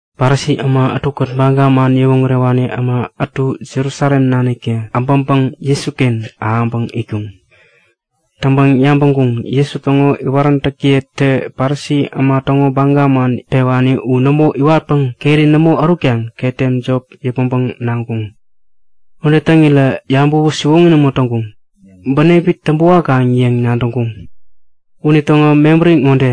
Parisi äma ätukät Baga man yäwoŋärewani äma ätu Jerusalem naniktä äbäŋpäŋ Jesuken ahäŋpäŋ itkuŋ. Täŋpäŋ yabäŋkuŋ; Jesu täŋo iwaräntäkiyetä Parisi äma täŋo baga man pewani u nämo iwatpäŋ keri nämo ärutkaŋ ketem jop yäpmäŋpäŋ naŋkuŋ. Ude täŋirä yabäwä siwoŋi nämo täŋkuŋ. Bänepi täŋpä wakaŋ yäŋ nadäŋkuŋ. Unitäŋo mebäri ŋode;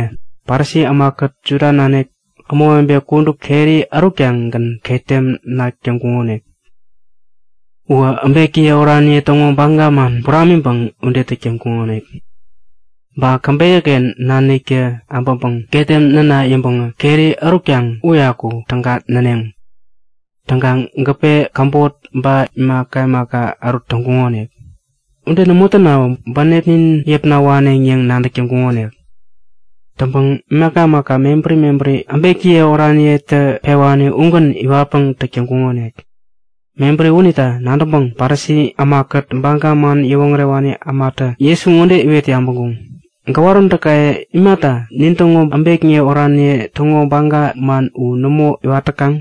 Parisi ämakät Juda nanik ämawebe kudup keri ärutkaŋ-gän ketem nak täŋkuŋonik. Uwä äbekiye oraniye täŋo baga man buramiŋpäŋ ude täk täŋkuŋonik. Ba käbeyäken naniktä äbäŋpäŋ ketem näna yäŋpäŋä keri ärutkaŋ uyaku täga näneŋ. Täŋkaŋ gäpe, käbot ba imaka imaka ärut täŋkuŋonik. Ude nämo tänawä bänepnin yäpna waneŋ yäŋ nadäk täŋkuŋonik. Täŋpäŋ imaka imaka mebäri mebäri äbekiye oraniyetä pewani ugän iwatpäŋ täk täŋkuŋonik. Mebäri unita nadäŋpäŋ Parisi ämakät Baga man yäwoŋärewani ämatä Jesu ŋode iwet yabäŋkuŋ; Gäwaräntäkaye imata nintäŋo äbekniye oraniye täŋo baga man u nämo iwat täkaŋ?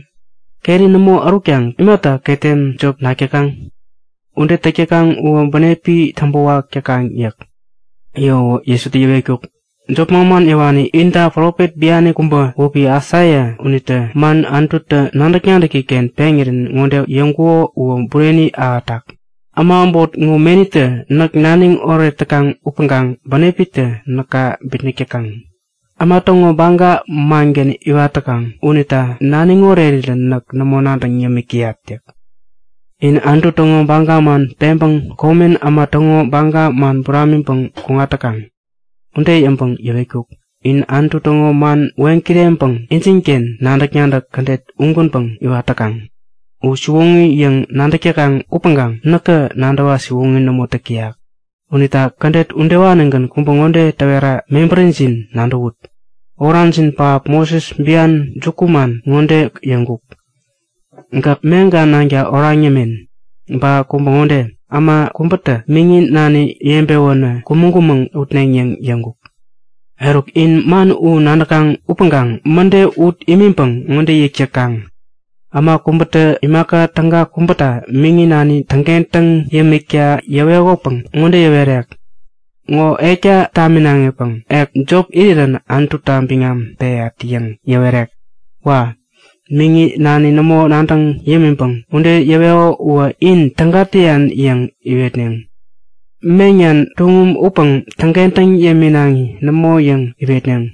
Keri nämo ärutkaŋ imata ketem jop nak täkaŋ? Ude täk täkaŋ uwä bänepi täŋpäwak täkaŋ yäk. Yäwäwä Jesutä yäwetkuk; Jop manman yäwani inta profet biani kubä wäpi Aisaia unitä man Anututä nadäk-nadäki-ken peŋirän ŋode yäŋkuko uwä bureni ahätak; Äma äbot ŋo menitä näk naniŋ oret täkaŋ upäŋkaŋ bänepitä näka bitnäk täkaŋ. Äma täŋo baga mangän iwat täkaŋ unita naniŋ orerirä näk nämo nadäŋ yämik täyat yäk. In Anutu täŋo baga man peŋpäŋ komen äma täŋo baga man buramiŋpäŋ kuŋat täkaŋ. Ude yäŋpäŋ yäwetkuk; In Anutu täŋo man weŋkireŋpäŋ injinken nadäk-nadäk kädet ugänpäŋ iwat täkaŋ. U siwoŋi yäŋ nadäk täkaŋ upäŋkaŋ näkä nadäwa siwoŋi nämo täk täyak. Unita kädet udewanigän kubä ŋode täwera mebärijin nadäwut. Orajin pähap Moses bian jukuman ŋode yäŋkuk; Gäk meŋka nanka oraŋ yämen. Ba kubä ŋode; Äma kubätä miŋi nani yebewänä kumäŋ-kumäŋ utneŋ yäŋ yäŋkuk. Eruk, in man u nadäkaŋ upäŋkaŋ mäde ut imiŋpäŋ ŋode yäk täkaŋ; Äma kubätä imaka täga kubäta miŋi nani täŋkentäŋ yämikta yäwekopäŋ ŋode yäwerek; Ŋo ekta taminaŋipäŋ ek jop irirän Anututa biŋam peyat yäŋ yäwerek. Wa! Miŋi nani nämo nadäŋ yämiŋpäŋ ude yäweko uwä in täga täyan yäŋ iwetneŋ. Meŋnan tuŋum upäŋ täŋkentäŋ yäminaŋi nämo yäŋ iwetneŋ.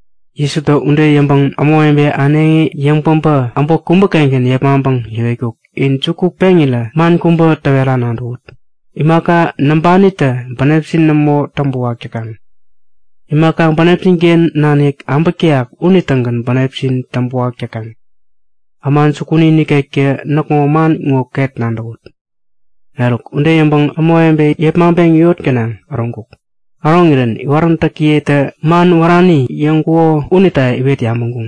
Jesutä ude yäŋpäŋ ämawebe äneŋi yäŋpäbä äbot kubägän yepmaŋpäŋ yäwetkuk; In juku peŋirä man kubä täwera nadäwut; Imaka näŋpanitä bänepjin nämo täŋpäwak täkaŋ. Imaka bänepjin-ken nanik äbäk täyak unitägän bänepjin täŋpäwak täkaŋ. Äma jukuni nikektä näkŋo man ŋo ket nadäwut! Eruk ude yäŋpäŋ ämawebe yepmaŋpeŋ yot gänaŋ äroŋkuk. Äroŋirän iwaräntäkiyetä man wärani yäŋkuko unita iwet yabäŋkuŋ.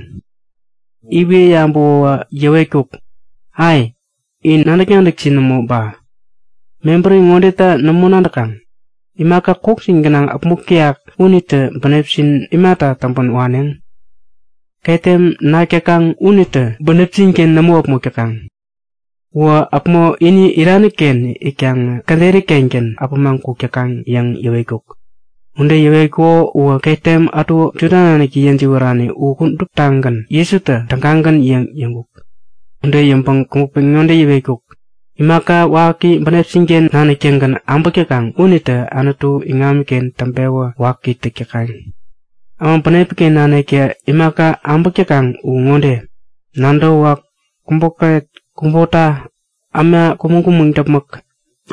Iwet yabäwä yäwetkuk; Ai! In nadäk-nadäkjin nämo ba? Mebäri ŋodeta nämo nadäkaŋ? Imaka kokjin gänaŋ äpmok täyak unitä bänepjin imata täŋpän waneŋ? Ketem nak täkaŋ unitä bänepjin-ken nämo äpmok täkaŋ. Uwä päpmo ini irani-ken itkaŋä käderi-kengän äpämaŋ kuk täkaŋ yäŋ yäwetkuk. Ude yäwetkuko uwä ketem ätu Juda naniktä yäjiwärani u kuduptagän Jesutä tägagän yäŋ yäŋkuk. Ude yäŋpäŋ kubä pen ŋode yäwetkuk; Imaka waki bänepjin-ken nanik-tägän äbäk täkaŋ unitä Anutu iŋamiken täŋpewä waki täk täkaŋ. Äma bänepi-ken naniktä imaka abäk täkaŋ u ŋode; Nadäwäwak, kubokäret, kubota, äma kumäŋ-kumäŋ däpmäk,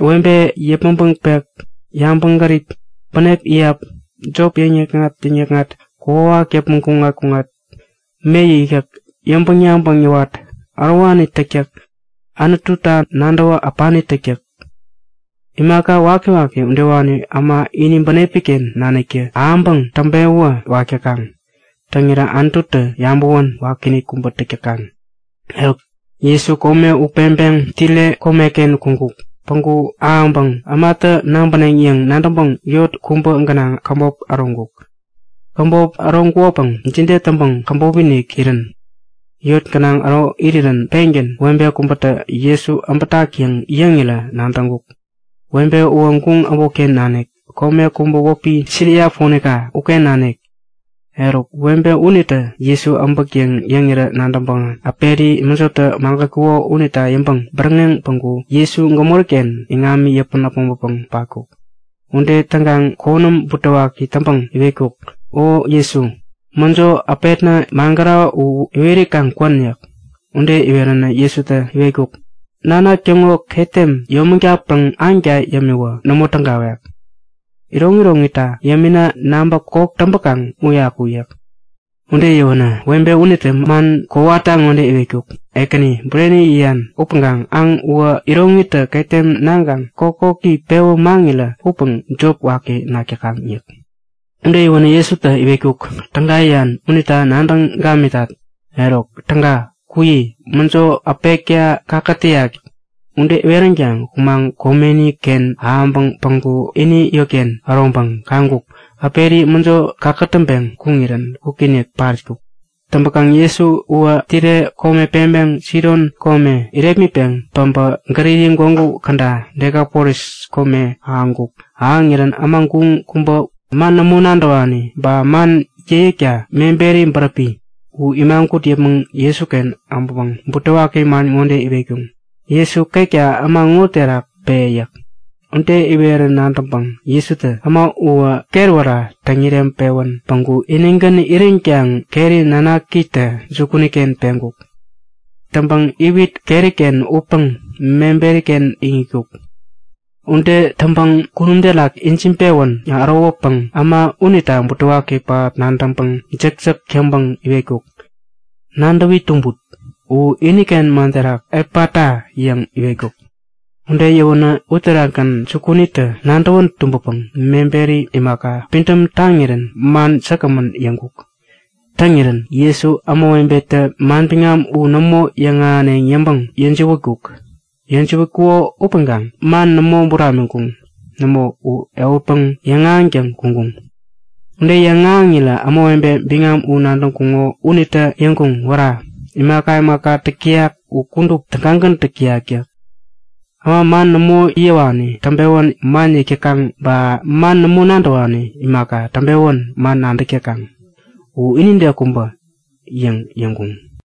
webe yäpmäŋpäŋ pek, yabäŋgärip, bänep iyap, jop yäkŋat-yäkŋat, kokwawak yäpmäŋ kuŋat-kuŋat, me yäkyäk, yäŋpäŋ-yabäŋ yäwat, ärowani täktäk, Anututa nadäwä äpani täktäk. Imaka wakiwaki udewani äma ini bänepi-ken naniktä ahäŋpäŋ täŋpewä wak täkaŋ. Täŋirä Anututä yabäwän wakiinik kubä täk täkaŋ. Eruk Jesu kome u peŋpeŋ Tire komeken kuŋkuk. Päŋku ahäŋpäŋ ämatä nabäneŋ yäŋ nadäŋpäŋ yot kubä gänaŋ käbop äroŋkuk. Käbop äroŋkukopäŋ jide täŋpäŋ käbop-inik irän? Yot gänaŋ äro irirän pengän webe kubätä Jesu äbäk yäŋ yäŋirä nadäŋkuk. Webe uwä guŋ äbotken nanik, kome kubä wäpi Siria Ponika uken nanik. Eruk webe unitä Jesu äbäk yäŋ yäŋirä nadäŋpäŋä äperi mäjotä magätkuko unita yäŋpäŋ bäräŋeŋ päŋku Jesu gämori-ken iŋami yäpän äpmoŋpäpäŋ patkuk. Ude täŋkaŋ konäm butewaki täŋpäŋ iwetkuk; O Jesu, mäjo äpetna magärako u iweri kaŋ kwän yäk. Ude iweränä Jesutä iwetkuk; Nanak täŋo ketem yäyomägatpäŋ aŋta yämiwä nämo tägawek. Iroŋiroŋita yämina naŋpä koki täŋpäkaŋ uyaku yäk. Ude yäwänä webe unitä man kowata ŋode iwetkuk; Ekäni, bureni yäyan upäŋkaŋ aŋ uwä iroŋitä ketem naŋkaŋ kokoki pewä maŋirä upäŋ jop waki nak täkaŋ yäk. Ude yäwänä Jesutä iwetkuk; Täga yäyan unita nadäŋ gamitat. Eruk täga, kuyi! Mäjo äpetka kakätäyak yäk. Ude iweränkaŋ kumaŋ komeni-ken ahäŋpäŋ päŋku ini yotken äroŋpäŋ kaŋkuk; Äperi mäjo kakätäŋpeŋ kuŋirän kwikinik patkuk. Täŋpäkaŋ Jesu uwä Tire kome peŋpeŋ Sidon kome irepmitpäŋ päbä Galili gwägu käda Dekapolis kome ahäŋkuk. Ahäŋirän äma guŋ kubä, man nämo nadäwani ba man yäkyäkta meberi bäräpi, u imagut yäpmäŋ Jesuken ahäŋpäŋ butewaki man ŋode iwetkuŋ; Jesu, ketka äma ŋo terak pe! yäk. Ude iwerä nadäŋpäŋ Jesutä äma uwä ketwära täŋireŋpewän päŋku inigän iränkaŋ keri nanakitä jukuni-ken peŋkuk. Täŋpäŋ iwit keri-ken utpäŋä meberiken iŋitkuk. Ude täŋpäŋ kunum terak ijiŋpewän ärowäpäŋ äma unita butewaki pähap nadäŋpäŋ jäkjäk yäŋpäŋ iwetkuk; Nadäwi tumbut! (U iniken man terak Epata! yäŋ iwetkuk.) Ude yäwänä uterakgän jukunitä nadäwän tumbäpäŋ meberi imaka pidäm taŋirän man säkgämän yäŋkuk. Täŋirän Jesu ämawebetä manbiŋam u nämo yäŋahäneŋ yäŋpäŋ yäjiwätkuk. Yäjiwätkuko upäŋkaŋ man nämo buramiŋkuŋ. Nämo, u ehutpäŋ yäŋahäŋtäŋ kuŋkuŋ. Ude yäŋahäŋirä ämawebe biŋam u nadäŋkuŋo unitä yäŋkuŋ; Wära! Imaka imaka täk täyak u kudup tägagän täk täyak! yäk. Äma man nämo yäwani täŋpewän man yäk täkaŋ ba man nämo nadäwani imaka täŋpewän man nadäk täkaŋ. U inide kubä! yäŋ yäŋkuŋ.